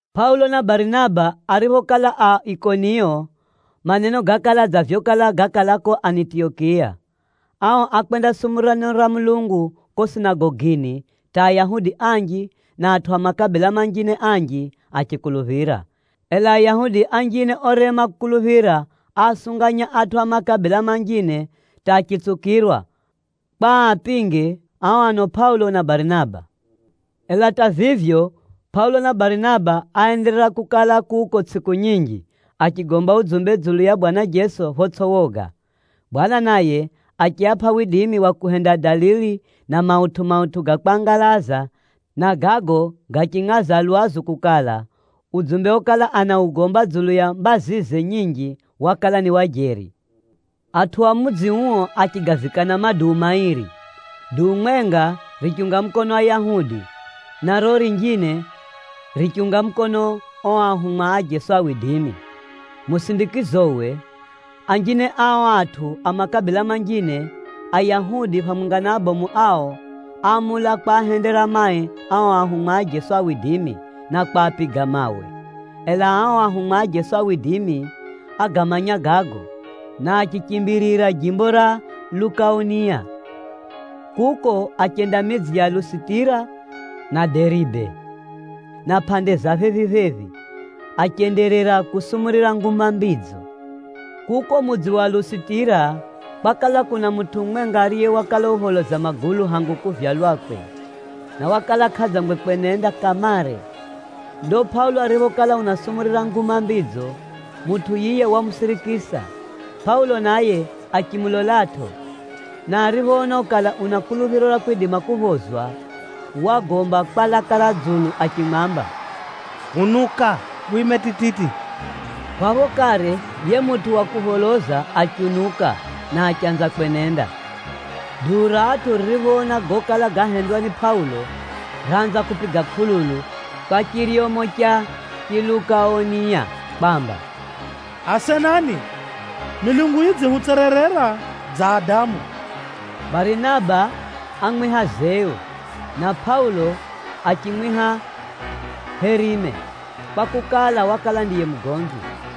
Pʼaulo na Barinaba ariphokala a Ikoniyo, maneno gákala dza vyokala gákala ko Anitiyokiya. Ao ákwendasumurira neno ra Mulungu ko sinagogini hata Ayahudi anji na atʼu a makabila manjine anji achikuluphira. Ela Ayahudi anjine orema kukuluphira, áasunganya atʼu a makabila manjine hata achitsukirwa, kwa aapinge ao ano Pʼaulo na Barinaba. Ela hata vivyo, Pʼaulo na Barinaba áenderera kukala kuko tsʼiku nyinji, achigomba udzumbe dzulu ya Bwana Jeso photsʼi woga. Bwana naye achiapʼa widimi wa kuhenda dalili na mautʼu-mautʼu ga kwangalaza na gago gachingʼaza lwazu kukala, udzumbe okala anaugomba dzulu ya mbazize nyinji, wakala ni wa jeri. Atʼu a mudzi uo achigavikana maduu mairi. Duu mwenga richiunga mukono Ayahudi, na riro rinjine richiunga mukono o ahumwa a Jeso. Musindikizowe, anjine a o atʼu a makabila manjine, Ayahudi phamwenga na abomu ao, áamula kwahendera mai ao ahumwa a Jeso, na kwapiga mawe. Ela ao ahumwa a Jeso ágamanya gago, na achichimbirira jimbo ra Lukaoniya. Kuko, achenda midzi ya Lusitira na Deribe, na pʼande za phephi-phephi, achenderera kusumurira Nguma Mbidzo. Kuko mudzi wa Lusitira, kwakala kuna mutʼu mumwenga ariye wakala upholoza magulu hangu kuvyalwakwe, na wakala kʼadzangwe kwenenda kamare. Ndo Pʼaulo ariphokala unasumurira Nguma Mbidzo, mutʼu yiye wamusirikisa. Pʼaulo naye achimulolatʼo, na ariphoona kukala una kuluphiro ra kwidima kuphozwa, wagomba kwa laka ra dzulu achimwamba, “Unuka wime tititi.” Phapho kare, yiye mutʼu wa kupholoza achiunuka, na achanza kwenenda. Duu ra atʼu ririphoona gokala gahendwa ni Pʼaulo, raanza kupiga kʼululu kwa chiryomo cha Chilukaoniya kwamba, “Asenani, milungu yidzihutsererera dza adamu!” Barinaba ámwiha Zeu, na Pʼaulo achimwiha Herime, kwakukala, wakala ndiye mugomvi.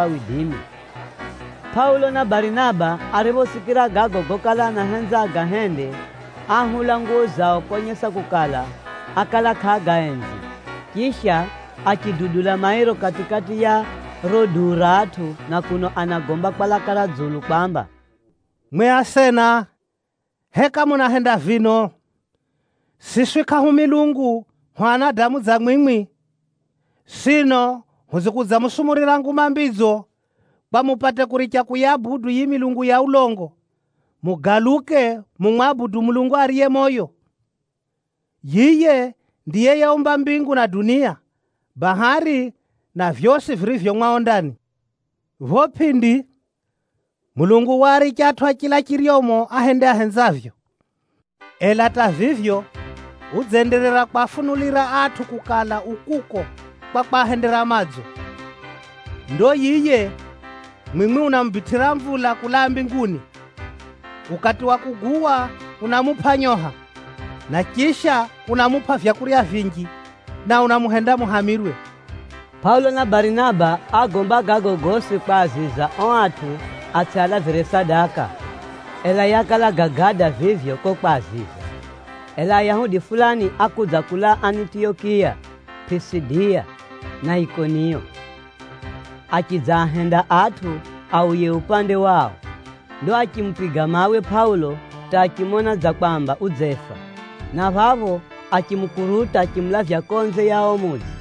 Ahumwa Pʼaulo na Barinaba ariphosikira gago gokala anahenza agahende, áahula nguwo zao konyesa kukala, ákala kʼaagaenzi. Chisha, achidudula mairo kati-kati ya riro duu ra atʼu na kuno anagomba kwa laka ra dzulu kwamba, “Mwi asena, heka munahenda vino? Siswi kʼahu milungu, hu anadamu dza mwimwi. Sino hudzikudzamusumurira Nguma Mbidzo kwa mupate kuricha kuyabudu yiyi milungu ya ulongo, mugaluke mumwabudu Mulungu ariye moyo. Yiye ndiye yeumba mbingu na itsʼi, bahari na vyosi virivyo mumo. Pho pʼindi, Mulungu waaricha atʼu a chila chiryomo ahende ahenzavyo. Ela hata vivyo, udzenderera kwafunulira atʼu kukala u kuko kwa kwahendera madzo. Ndo yiye mwimwi unamubitʼira mvula kulaa mbinguni. Ukati wa kuguwa, unamupʼa nyoha, na chisha unamupʼa vyakurya vinji, na unamuhenda muhamirwe.” Pʼaulo na Barinaba ágomba gago gosi kwaziza o atʼu atsʼialavire sadaka, ela yakala gagada vivyo ko kwaziza. Ela Ayahudi fulani ákudza kulaa Anitiyokiya-Pʼisidiya na Ikoniyo, achidzaahenda atʼu auye upande wao. Ndo achimupiga mawe Pʼaulo hata achimona dza kwamba udzefa, na phapho achimukuruta achimulavya konze ya o mudzi.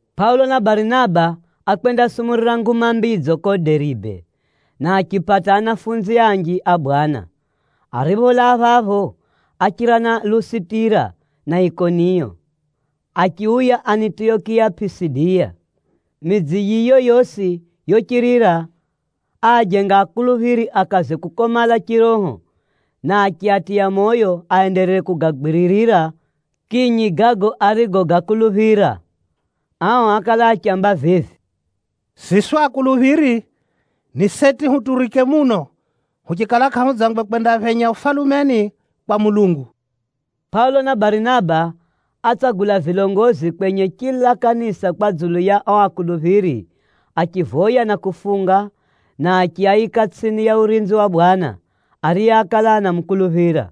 Pʼaulo na Barinaba ákwendasumurira Nguma Mbidzo ko Deribe, na achipata anafunzi anji a Bwana. Aripholaa phapho, áchira na Lusitira na Ikoniyo, achiuya Anitiyokiya-Pʼisidiya. Midzi yiyo yosi yochirira, áajenga anafunzi akaze kukomala chiroho, na achiatiya moyo aenderere kugagwiririra kinyi gago arigogakuluphira. Ao ákala achiaamba vivi, “Siswi akuluphiri, ni seti huturike muno huchikala kʼahudzangwe kwendaphenya Ufalumeni kwa Mulungu.” Pʼaulo na Barinaba átsagula vilongozi kwenye chila kanisa kwa dzulu ya o akuluphiri, achivoya na kufunga, na achiaika tsʼini ya urinzi wa Bwana, ariye ákala anamukuluphira.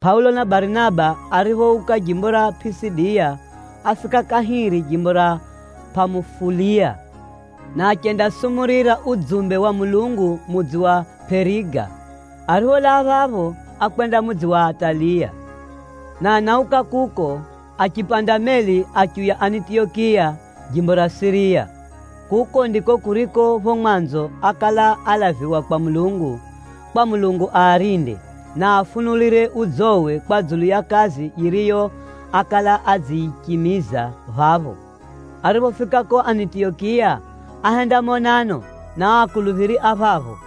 Pʼaulo na Barinaba ariphouka jimbo ra Pʼisidiya, áfika kahiri jimbo ra Pʼamufuliya, na achendasumurira udzumbe wa Mulungu mudzi wa Pʼeriga. Aripholaa phapho, ákwenda mudzi wa Ataliya, na anauka kuko, achipanda meli achiuya Anitiyokiya, jimbo ra Siriya. Kuko ndiko kuriko, pho mwanzo ákala alaviwa kwa Mulungu, kwa Mulungu aarinde, na aafunulire udzowe kwa dzulu ya kazi yiriyo ákala adziyichimiza phapho. Ariphofika ko Anitiyokiya, áhenda monano na o akuluphiri a phapho,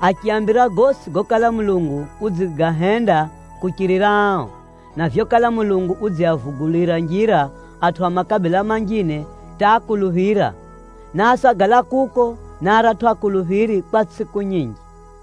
achiaambira gosi gokala Mulungu udzigahenda kuchirira ao, na vyokala Mulungu udziavugulira njira atʼu a makabila manjine hata akuluphira. Na ásagala kuko na aratʼu anafunzi kwa tsʼiku nyinji.